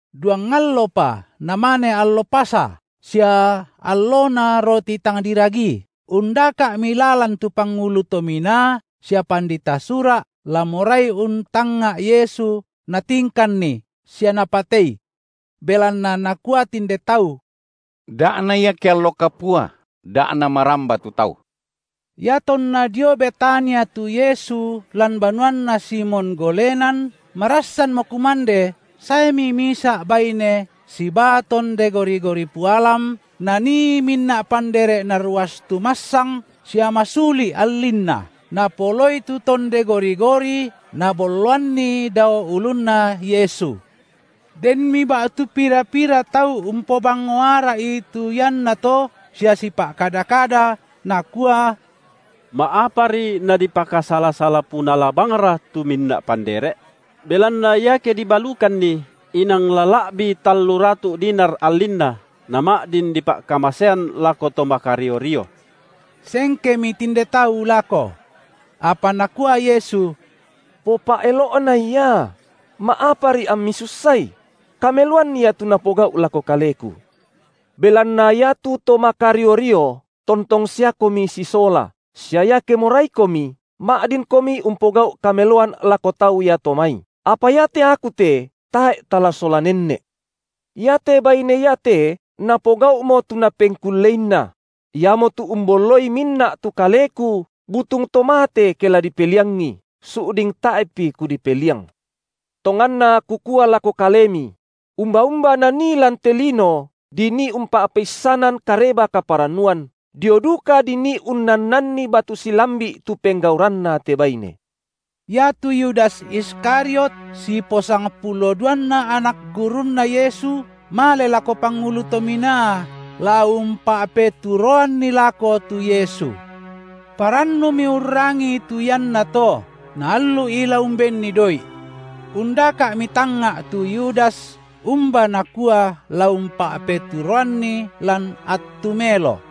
Duang allopa namane allo Pasa sia allona roti tang diragii; undaka’mi lalan tu pangulu to minaa sia pandita Sura’ la morai untangnga’ Yesu natingkanNi sia napatei. Belanna nakua tinde tau: Da’na ia ke allo kapua, da’ namaramba tu tau. Iatonna dio Betania tu Yesu lan banuanna Simon golenan, marassanmo kumande, saemi misa’ baine sibaa tonde gori-gori pualam nanii minna’ pandere’ narawastu massang sia masuli’ allinna; napoloi tu tonde gori-gori nabolloanni dao ulunna Yesu. Denmi ba’tu pira-pira tau umpobang-ngo ara’i tu iannato sia sipa’kada-kada, nakua: Ma’apari nadipakasala-sala punala bangra tu minna’ pandere’? Belanna iake dibalukanni, inang la la’bi tallu ratu’ dinar allinna nama’din dipa’kamasean lako to makario-rio. Sengkemi tinde tau lako. Apa nakua Yesu: Popa’elo’nai ia; ma’apari ammi sussai? kameloan ia tu napogau’ lako Kaleku. Belanna iatu to makario-rio tontong siakomi sisola, sia iake moraikomi, ma’dinkomi umpogau’ kameloan lako tau iato mai, apa iate Aku te tae’ tala sola nenne’. Iate baine iate napogau’mo tu napengkulleinna; iamotu umbolloi minna’ tu Kaleku butung to mate ke la dipeliangi, su’ding tae’pi Kudipeliang. Tonganna Kukua lako kalemi; umba-umba nanii lan te lino dinii umpa’peissanan Kareba kaparannuan, dio duka dinii unnannanni batu silambi’ tu penggauranna te baine. Iatu Yudas Iskariot siposangpuloduanna anak gurunNa Yesu, male lako pangulu to minaa la umpa’peturoanNi lako tu Yesu. Parannumi urrangii tu iannato, na allu’i la umbenni doi’. Undaka’mi tangnga’ tu Yudas umba nakua la umpa’peturoanNi lan attu melo.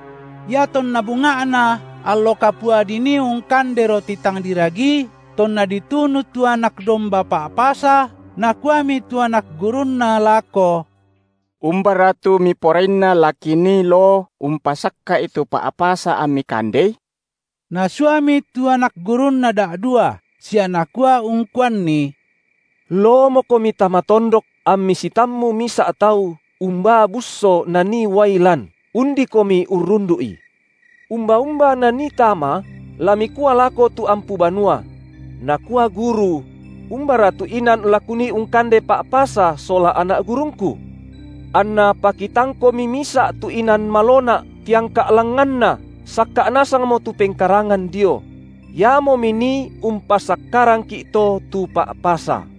Iatonna bunga’na allo kapua dinii ungkande roti tang diragi, tonna ditunu tu anak domba Pa’pasa, nakuami tu anak gurunNa lako: Umbara tu Miporainna la kinii loo umpasakka’i tu Pa’pasa amMi kandei? Nasuami tu anak gurunNa da’dua sia Nakua ungkuanni: Loomokomi tama tondok, ammi sitammu misa’ tau umbaa busso nanii uai lan, undikomi urrundu’i. Umba-umba nanii tama, la mikua lako tu ampu banua: Nakua Guru: Umbara tu inan la Kunii ungkande Pa’pasa sola anak gurungKu? Anna pakitangkomi misa’ tu inan malona’, tiangka’ langnganna, sakka’ nasangmo tu pengkarangan dio; iamo minii umpasakkarangki’ to tu Pa’pasa.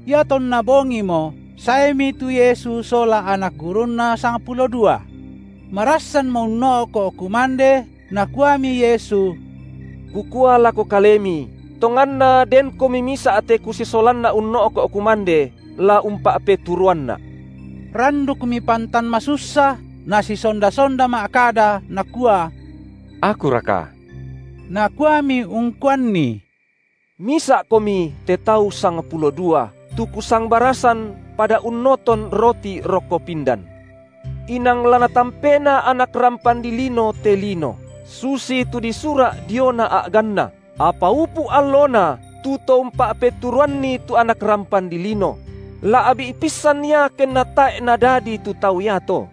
Iatonna bongimo saemi tu Yesu sola anak gurunNa sangpulo dua. Marassanmo unno’ko’ kumande, Nakuami Yesu: Kukua lako kalemi, tonganna denkomi misa’ te Kusisolanna unno’ko’ kumande, la umpa’peturoanNa’. Randukmi pantan masussa, nasisonda-sonda ma’kada nakua: Akuraka? Nakuami ungkuanni: Misa’komi te tau sangpulo dua, tu Kusangbarasan pada unnoton roti rokko pindan. Inang la Natampena Anak rampan dilino te lino, susitu disura’ diona a’ganNa, apa upu’ allona tu to umpa’peturoanNi tu Anak rampan dilino; la’bi’ pissan ia kenna tae’ nadadi tu tau iato.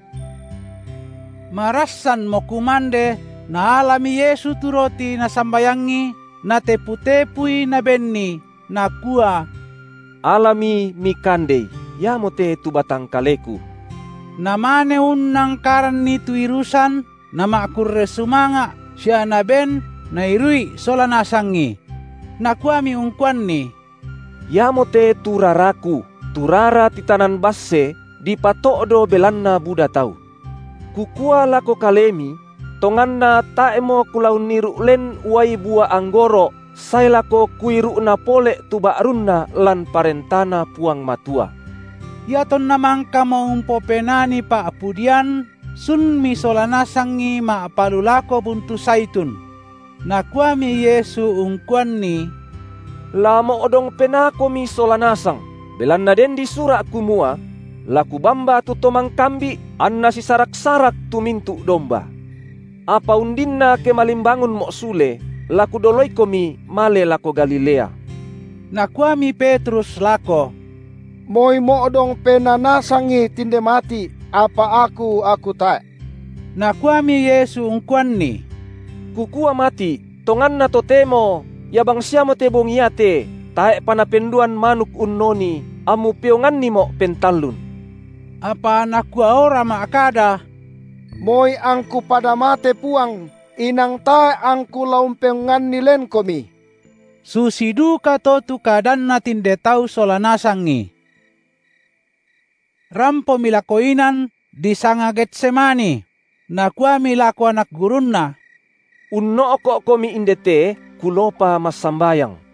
Marassanmo kumande, Naalami Yesu tu roti Nasambayangi, Natepu-tepui Nabenni, Nakua: Alami, mikandei, iamote tu batang kaleKu. Namane unnangkaranni tu irusan, Nama’kurre sumanga’ sia Naben, nairu’i sola nasangi. Nakuami ungkuanni: Iamote tu raraKu, tu rara titanan basse, dipato’do belanna buda tau. Kukua lako kalemi: Tonganna tae’mo Kula unniru’ len uai bua anggoro’ sae lako Kuiru’na pole’ tu ba’runna lan ParentaNa Puang Matua. Iatonna mangkamo umpopenani pa’pudian, sunmi sola nasangi ma’palulako buntu Zaitun. Nakuami Yesu ungkuanni: La mo’dong penaakomi sola nasang, belanna den disura’ kumua: La kubamba tu to mangkambi’, anna sisarak-sarak tu mintu’ domba. Apa undinna ke malimbangunMo’ sule, la Kudoloikomi male lako Galilea. Nakuami Petrus lako: Moi mo’dong penaa nasangi tinde mati’, apa aku aku tae’. Nakuami Yesu ungkuanni: Kukua mati’, tonganna totemo ia bangsiamote bongi iate tae’pa napenduan manuk unnoni, ammu peongannimo’ pentallun. Apa nakuaora ma’kada: Moi angku pada mate Puang, inang tae’ angku la umpeonganni lenKomi. Susi dukato tu kadanna tinde tau sola nasangi. Rampomi lako inan disanga Getsemani; Nakuami lako anak gurunNa: Unno’ko’komi inde te, Kuloopa massambayang.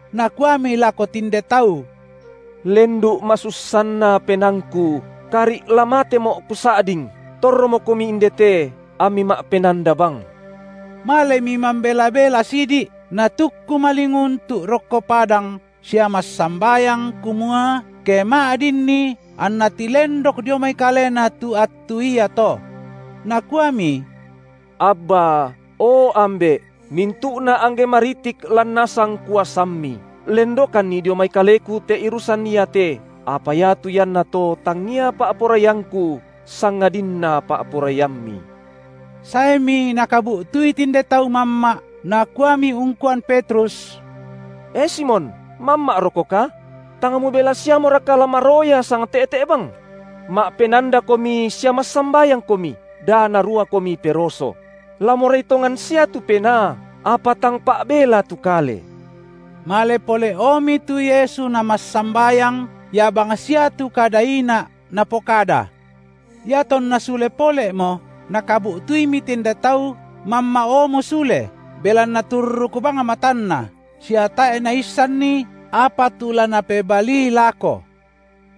Nakuami lako tinde tau: Lendu’ masussanna penaangKu, kari’ la matemo’ Kusa’ding, torromokomi inde te, ammi ma’penanda bang. Malemi mambela-bela sidi’, Natukku malinguntu’ rokko padang sia massambayang kumua, ke ma’dinni anna tilendok dio mai Kalena tu attu iato. Nakuami: Abba, o Ambe’, mintu’na angge maritik lan nasang kuasamMi, lendokanni dio mai Kaleku te irusan iate, apa iatu iannato tangia pa’poraiangKu sangadinna pa’poraiamMi. Saemi Nakabu’tui tinde tau mamma’, Nakuami ungkuan Petrus: E Simon mamma’rokoka? Tang mubela siamoraka la maroya sangte’te’ bang? Ma’penandakomi sia massambayangkomi, da naruakomi peroso; la morai tongan sia tu penaa, apa tang pa’bela tu kale. Male pole’omi tu Yesu Namassambayang, ia bangsia tu kada ina’ Napokada. Iatonna sule pole’mo Nakabu’tuimi tinde tau mamma’omo sule, belanna turruk bang matanna, sia tae’ naissanni, apa tu la napebalii lako.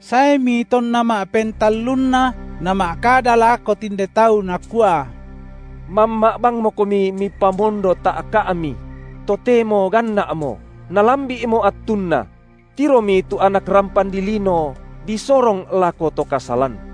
Saemi tonna ma’pentallunna Nama’kada lako tinde tau Nakua: Mamma’ bangmokomi mipamondo ta’ka’mi; totemo ganna’mo; nalambi’mo attunna; tiromi tu Anak rampan dilino disorong lako to kasalan.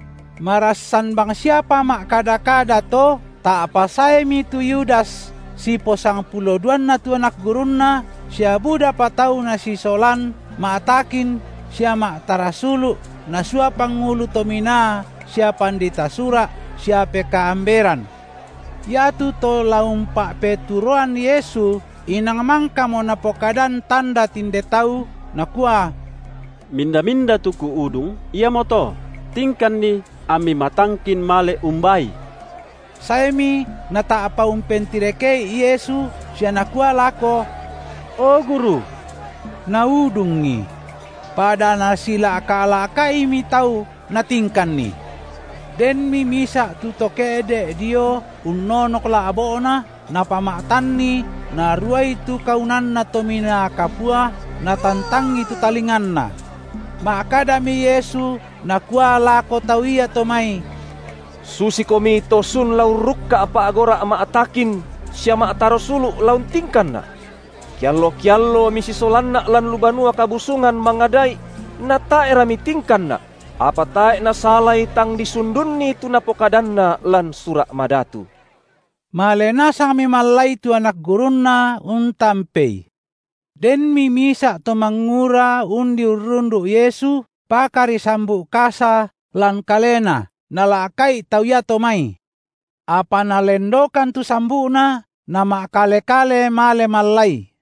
Marassan bangsiapa ma’kada-kada to, ta’pa saemi tu Yudas siposangpuloduanna tu anak gurunNa, sia budapa tau nasisolan ma’takin sia ma’tarasulu’ nasua pangulu to minaa sia pandita Sura’ sia pekaamberan. Iatu to la umpa’peturoan Yesu inang mangkamo napokadan tanda tinde tau, nakua: Minda-minda tu kuudung, Iamoto; tingkanNi ammi matangkin male umbaai. Saemi nata’pa umpentireke’i Yesu sia nakua lako: O Guru!, naudungI. Pada nasila’ka’-la’ka’imi tau, natingkanNi. Denmi misa’ tu to ke’de’ dio unnonok la’bo’na, napama’tanni naruai tu kaunanna Tominaa Kapua, natantangi tu talinganna. Ma’kadami Yesu Nakua lako tau iato mai: Susikomi to sun la urrukka’ pa’gora’ma’takin sia ma’tarasulu’ la untingkanNa’. Keallo-keallo misisolanNa’ lan lu Banua Kabusungan mangada’i; natae’ra mitingkanNa’; – apa tae’ nasalai tang disundunni tu dipokadanna lan Sura’ Madatu. Male nasangmi mallai tu anak gurunNa, untampeI. Denmi misa’ to mangura undi urrundu’ Yesu, pakari sambu’ kasa lan kalena, nala’ka’i tau iato mai. Apa nalendokan tu sambu’na, nama’kale-kale male mallai.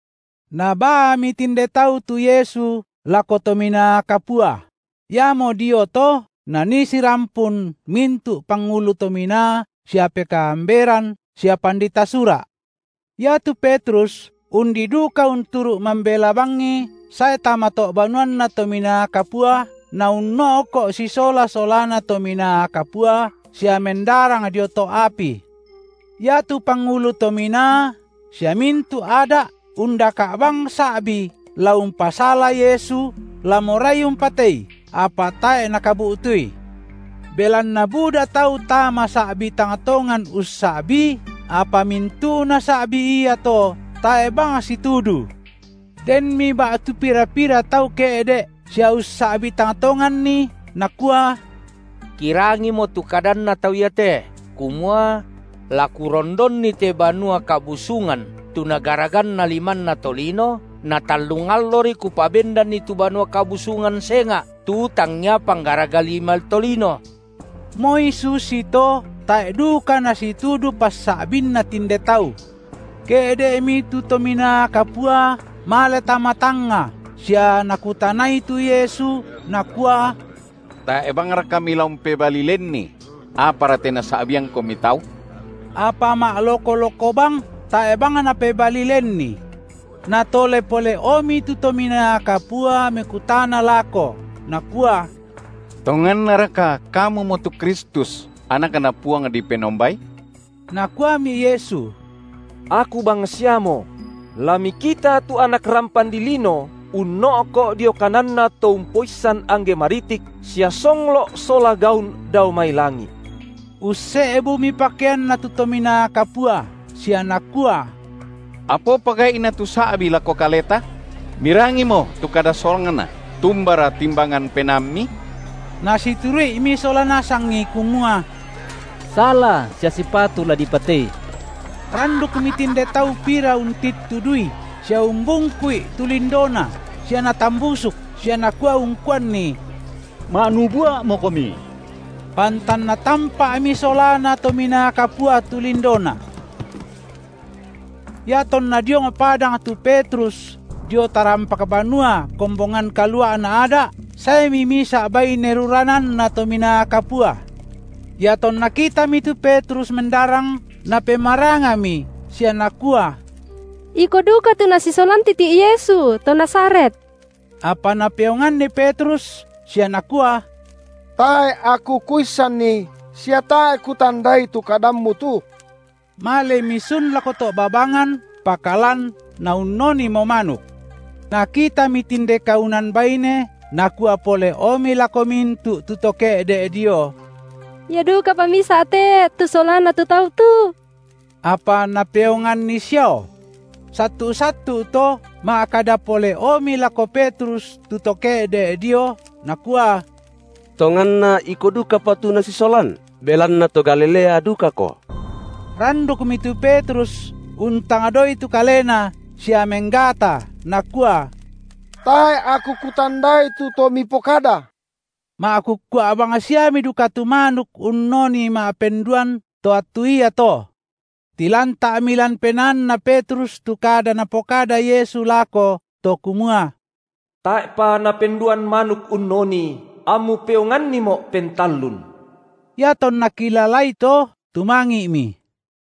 Nabaami tinde tau tu Yesu lako Tominaa Kapua; iamo dio to, nanii sirampun mintu’ pangulu to minaa sia pekaamberan sia pandita Sura’. Iatu Petrus undi duka unturu’ mambela bangI sae tama to’ banuanna Tominaa Kapua, naunno’ko’ sisola solana tominaa kapua sia mendarang dio to’ api. Iatu pangulu to minaa sia mintu’ Ada’ undaka’ bang sa’bi la umpasala Yesu la morai umpatei, apa tae’ nakabu’tui. Belanna buda tau tama sa’bi tang tongan ussa’bii, apa mintu’na sa’bi iato tae’ bang situdu. Denmi ba’tu pira-pira tau ke’de’ sia ussa’bii tang tonganni, nakua: Kirangimo tu kadanNa tau iate kumua: La Kurondonni te Banua Kabusungan tu nagaraganna limanna tolino na tallung allori Kupabendanni tu Banua Kabusungan senga’, tu tangia panggaraga lima tolino. Moi susito tae’ duka nasitudu passa’binna tinde tau. Ke’de’mi tu Tominaa Kapua male tama tangnga sia nakutanai tu Yesu nakua: Tae’ bangraka Mila umpebalii lenni? Apara te nasa’biangKomi tau? Apa ma’loko-loko bang, tae’ bang Napebalii lenni. Natole pole’omi tu Tominaa Kapua mekutana lako nakua: Tongannaraka Kamumo tu Kristus, AnakNa Puang dipenombai? Nakuami Yesu: Aku bangsiamo; la mikita tu Anak rampan dilino unno’ko’ dio kananNa Toumpoissan angge maritik sia songlo’ sola gaun dao mai langi’. Usse’bumi pakeanna tu Tominaa Kapua sia nakua: Apa opa gai’na tu sa’bi lako kaleta? Mirangimo tu kada solangna. Tumbara timbangan penaammi? Nasituru’imi sola nasangi kumua: sala sia sipatu la dipatei. Randukmi tinde tau pira untittudui sia umbungku’i tu lindoNa sia natambusuk sia nakua ungkuanNi: Ma’nubua’moKomi! Pantan natampa’mi solana tominaa kapua tu lindoNa. Iatonna diong padang tu Petrus dio tarampak banua kombongan kalua’na Ada’, saemi misa’ baine rurananna Tominaa Kapua. Iatonna kitami tu Petrus mendarang, napemarangami sia nakua: Iko duka tu Nasisolan titi’ Yesu, to Nazaret. Apa napeonganni Petrus sia nakua: Tae’ aku kuissanni sia tae’ kutandai tu kadammu tu. Malemi sun lako to’ babangan, pakalan naunnonimo manuk. Nakitami tinde kaunan baine, nakua pole’omi lako mintu’ tu to ke’de’ dio: Ia dukapa misa’ te, tu solana tu Tau tu. Apa napeonganni siao. Sattu’-sattu’ to ma’kada pole’omi lako Petrus tu to ke’de’ dio, nakua: Tonganna iko dukapa tu Nasisolan, belanna to Galilea dukako. Randukmi tu Petrus untangdoi tu kalena sia menggata nakua: Tae’ aku kutandai tu To mipokada. Ma’kukkua bang siami duka tu manuk unnoni ma’penduan to attu iato. Tilanta’mi lan penaanna Petrus tu kada Napokada Yesu lako, to kumua: Tae’pa napenduan manuk unnoni ammu peonganniMo’ pentallun. Iatonna kilalai to, tumangi’mi.